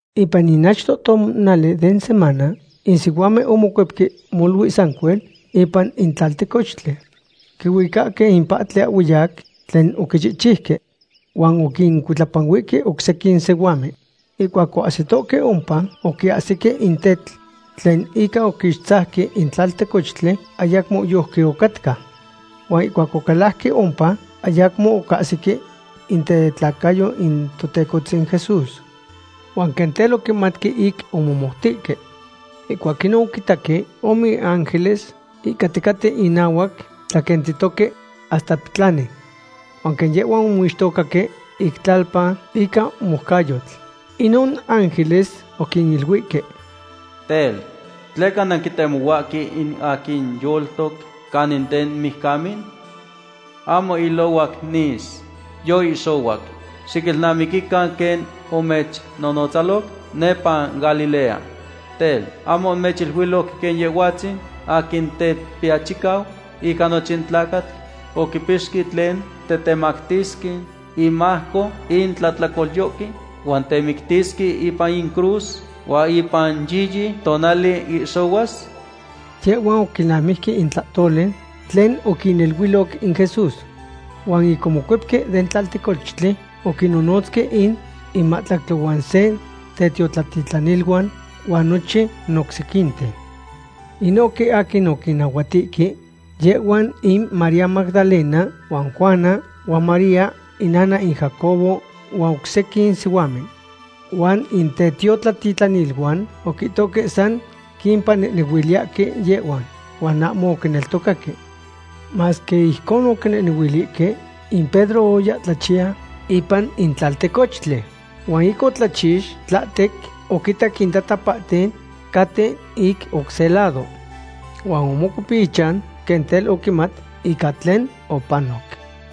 Ipan in achto tonali den semana, in sihuamen omocuepque molui sancuel ipan in tlaltecochtli. Quihuicahque in pahtli ahhueyac tlen oquichihchiuque. Huan oquincuitlapanuihque oc sequin sihuamen. Ihcuac oahsitoque ompa, ocahsique in tetl tlen ica oquixtzajque in tlaltecochtli ayacmo yojqui ocatca. Huan ihcuac ocalajque ompa, ayacmo ocahsique in tetlacayo in Totecohtzin Jesús. Huan quen tel oquimatque ic omomoutihque. Ihcuac inon oquinitaque ome ángeles ihcaticaten inahuac tlaquentitoque hasta petlani. Huan quen yehhuan omixtocaque ic tlalpa ica moucayotl, inon ángeles oquiniluihque: ―Tel, ¿tleca nanquitemohuahque in aquin yoltoc canin den mijcamen? Ahmo ilohuac nis. Yoihxohuac. Xiquilnamiquican quen omechnonotzaloc nepa Galilea. Tel, ¿ahmo mechiluiloc quen Yehhuatzin aquin Tetiachicau ica nochin tlacatl oquipixque tlen tetemactisque inmajco in tlahtlacolyohque huan temictisque ipan in cruz, huan ipan yiyi tonali ihxohuas? Yehhuan oquilnamijque in tlahtoli tlen oquiniluiloc in Jesús. Huan ic omocuepque den tlaltecochtli oquinnonotzque in mahtlactli huan se tetiotlatitlaniluan huan nochin oc sequinten. Inohque aquin oquinnahuatihque yehhuan in María Magdalena huan Juana huan María inana in Jacobo huan oc sequin sihuamen. Huan in tetiotlatitlaniluan oquihtohque san quipanehnehuiliyahque yehhuan. Huan ahmo oquineltocaque. Masque ijcon oquinehnehuilihque, in Pedro oya tlachiya ipan in tlaltecochtli. Huan ic otlachix tlahtec oquitac in tatapahten caten ic oc se lado. Huan omocuep ichan quen tel oquimat ica tlen opanoc.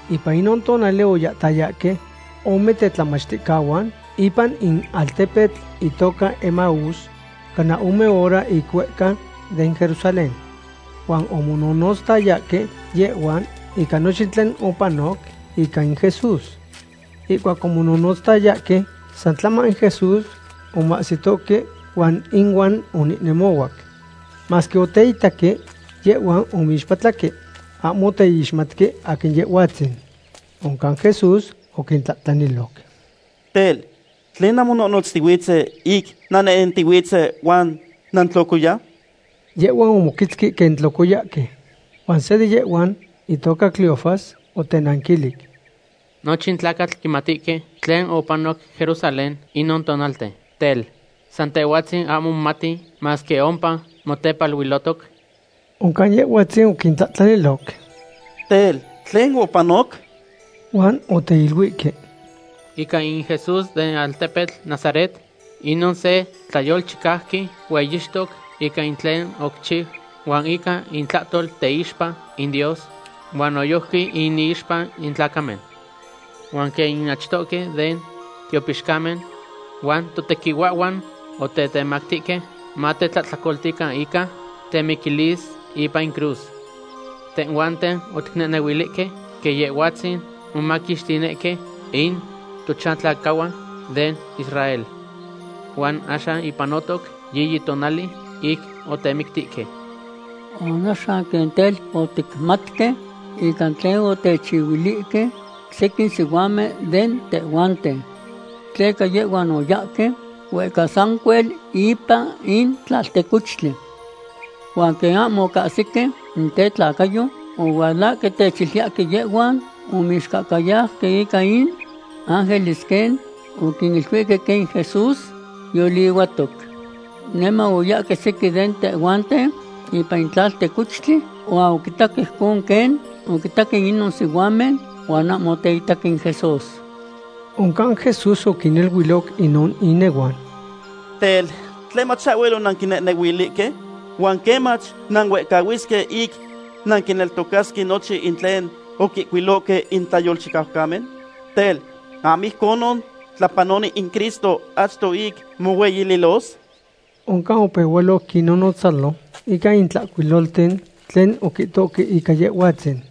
Ipan inon tonali oyahtayahque ome tetlamachticahuan ipan in altepetl itoca Emaús, cana ome hora ic huehca den Jerusalén. Huan omononotztayahque yehhuan ica nochin tlen opanoc ica in Jesús. Ihcuac omononotztayahque, san tlama in Jesús omahsitohque huan inuan onehnemohuac. Masque oteitaque, yehhuan omixpatlahque. Ahmo oteixmatque aquin Yehhuatzin. Oncan Jesús oquintlahtlaniloc: ―Tel ¿tlenon nanmononotztihuitzen ic nannehnentihuitzen huan nantlocoya? Yehhuan omoquetzque quen tlocoyahque. Huan se de yehhuan, itoca Cleofas, otenanquilic: ―Nochin tlacatl quimatihque tlen opanoc Jerusalén inin tonalten. Tel, ¿san tehhuatzin ahmo momati masque ompa motepaluilohtoc? Oncan Yehhuatzin oquintlahtlaniloc: ―Tel, ¿tlen opanoc? Huan oteiluihque: ―Ica in Jesús den altepetl Nazaret, inon se tlayolchicauqui hueyixtoc ica in tlen oquichiu huan ica itlahtol teixpa in Dios, huan noyojqui inixpa in tlacamen. Huan quen in achtohque den tiopixcamen huan totequihuahhuan otetemactihque matetlahtlacoltican ica temiquilis ipan in cruz. Tehhuanten oticnehnehuilihque quen Yehhuatzin momaquixtinihque in tochantlacahuan den Israel. Huan axan yipanotoc yiyi tonali ic otemictihque. Huan axan quen tel oticmatque ica tlen otechiluihque sequin sihuamen de tehhuanten. Tleca yehhuan oyahque huehca sancuel ipan in tlaltecochtli. Huan quen ahmo ocahsique in tetlacayo, ohualahque techiluiyahque yehhuan omixcahcayauque ica in ángeles quen oquiniluihque quen in Jesús yolihuahtoc. Niman oyahque sequin de tehhuanten ipan in tlaltecochtli huan oquitaque ijcon quen oquihtohque inon sihuamen, huan ahmo oteitaque in Jesús. Oncan Jesús oquiniluiloc inon inehuan: ―Tel, ¿tlemach ahhuel onanquinehnehuilihque? Huan ¿quemach nanuehcahuisque ic nanquineltocasque nochin in tlen oquihcuilohque in tlayolchicaucamen? Tel, ¿ahmo ijcon tlapanoloni in Cristo achto ic mohueyililos? Oncan opehualoc quinnonotzalo ica in Tlahcuilolten tlen oquihtohque ica Yehhuatzin.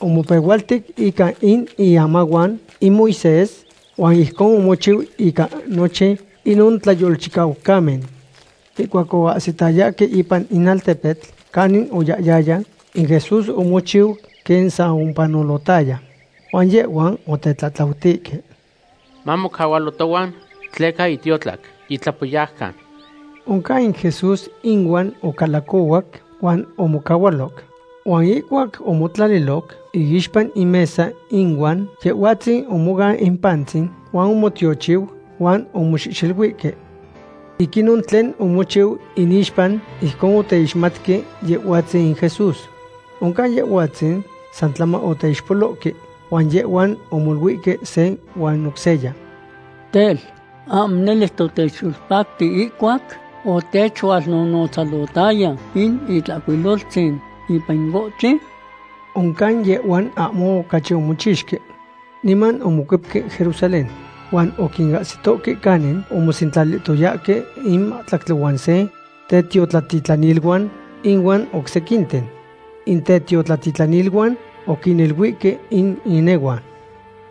Omopehualtic ica in iamahuan in Moisés huan ijcon omochiu ica nochin inon tlayolchicaucamen. Ihcuac oahsitayahque ipan in altepetl canin oyahyaya, in Jesús omochiu quen san opanolotaya. Huan yehhuan otetlatlautihque: ―Mamocahualo tohuan, tleca yitiotlac. Yitlapoyaucan. Oncan in Jesús inuan ocalacohuac huan omocahualoc. Huan ihcuac omotlaliloc iixpa in mesa inuan, Yehhuatzin omoan in pantzin huan omotiochiu huan omoxehxeluihque. Ic inon tlen omochiu inixpa, ijcon oteixmatque Yehhuatzin in Jesús. Oncan Yehhuatzin san tlama oteixpolohque. Huan yehhuan omoluihque se huan oc seya: ―Tel, ¿ahmo nele hasta otechyolpacti ihcuac otechualnonotzalotaya in Itlahcuiloltzin ipan in ohtli? Oncan yehhuan ahmo ocachi omochixque. Niman omocuepque Jerusalén. Huan oquinahsitohque canin omosentlalihtoyahque in mahtlactli huan se tetiotlatitlaniluan ihuan oc sequinten. In tetiotlatitlaniluan oquiniluihque in inehuan: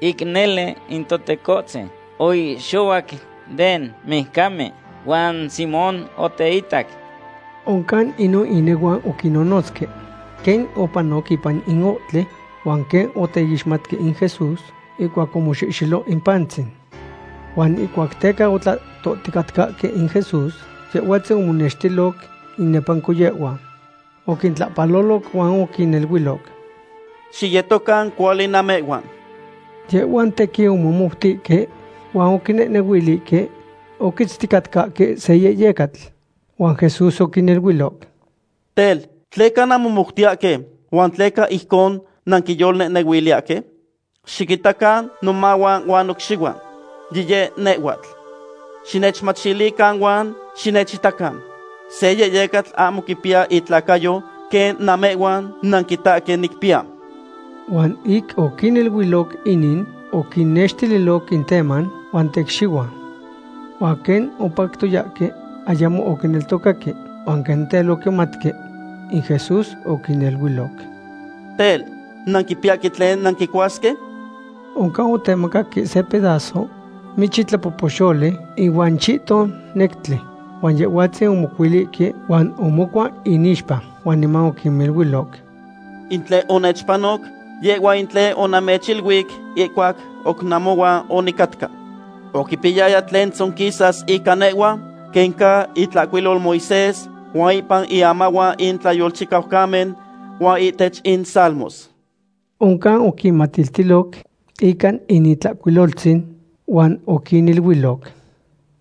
―Ic nele in Totecohtzin oihxohuac den mijcamen, huan Simón oteitac. Oncan inon inehuan oquinnonotzque quen opanoc ipan in ohtli, huan quen oteixmatque in Jesús ihcuac omoxehxelo in pantzin. Huan ihcuac teca otlahtohticatcahque in Jesús, Yehhuatzin omonextiloc inepanco yehhuan. Oquintlahpaloloc huan oquiniluiloc: ―Xiyetocan cuali namehhuan. Yehhuan tequin omomoutihque huan oquinehnehuilihque oquitzticatcahque se yehyecatl. Huan Jesús oquiniluiloc: ―Tel, ¿tleca nanmomoutiyahque, huan tleca ijcon nanquiyolnehnehuiliyahque? Xiquitacan nomahuan huan nocxihuan. Yiyeh nehhuatl. Xinechmachilican huan xinechitacan. Se yehyecatl ahmo quipiya itlacayo quen namehhuan nanquitahque nicpiya. Huan ic oquiniluiloc inin, oquinnextililoc in teman huan tecxihuan. Huan quen opactoyahque, ayamo oquineltocaque huan quen tel oquimatque. In Jesús oquiniluiloc: ―Tel, ¿nanquipiyahque tlen nanquicuasque? Oncan otemacaque se pedazo michi tlapohpoxoli ihuan chihton nectli. Huan Yehhuatzin omocuilihque huan omocua inixpa. Huan niman oquiniluiloc: ―In tlen onechpanoc, yehhua in tlen onamechiluic ihcuac oc namohuan onicatca. Oquipiyaya tlen tzonquisas ica nehhua quen ca itlanahuatil Moisés huan ipan iamahuan in tlayolchicaucamen huan ihtech in salmos. Oncan oquinmatiltiloc ica in Itlahcuiloltzin. Huan oquiniluiloc: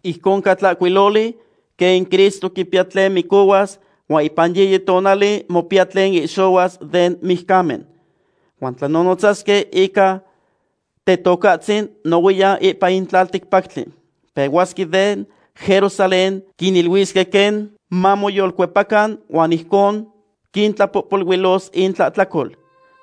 ―Ijcon ca tlahcuiloli quen in Cristo quipiya tlen micohuas huan ipan yiyi tonali mopiya tlen ihxohuas den mijcamen. Huan tlanonotzasque ica Tetocahtzin nohuiyan ipan in tlalticpactli. Pehuasque de Jerusalén quiniluisque quen mamoyolcuepacan huan ijcon quintlapohpoluilos intlahtlacol.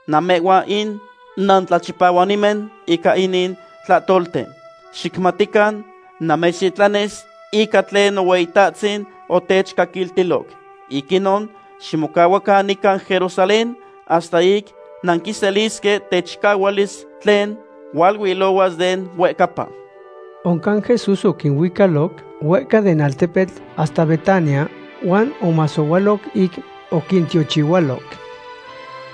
Namehhuan in nantlachipahuanimen ica inin tlahtolten. Xicmatican, namechtitlanis ica tlen Nohueyitahtzin otechcaquiltiloc. Ic inon ximocahuacan nican Jerusalén hasta ic nanquiselisque techicahualis tlen hualuilohuas den huehcapa. Oncan Jesús oquinuicaloc huehca den altepetl hasta Betania, huan omasohualoc ic oquintiochihualoc.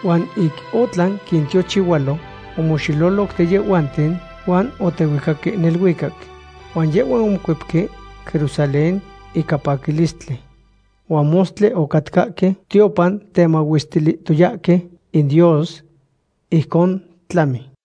Huan ic otlan quintiochihualo, omoxeloloc de yehhuanten huan otehuicaque neluicac. Huan yehhuan omocuepque Jerusalén ica paquilistli. Huan mostli ocatcahque tiopan temahuestilihtoyahque in Dios. Ijcon tlami.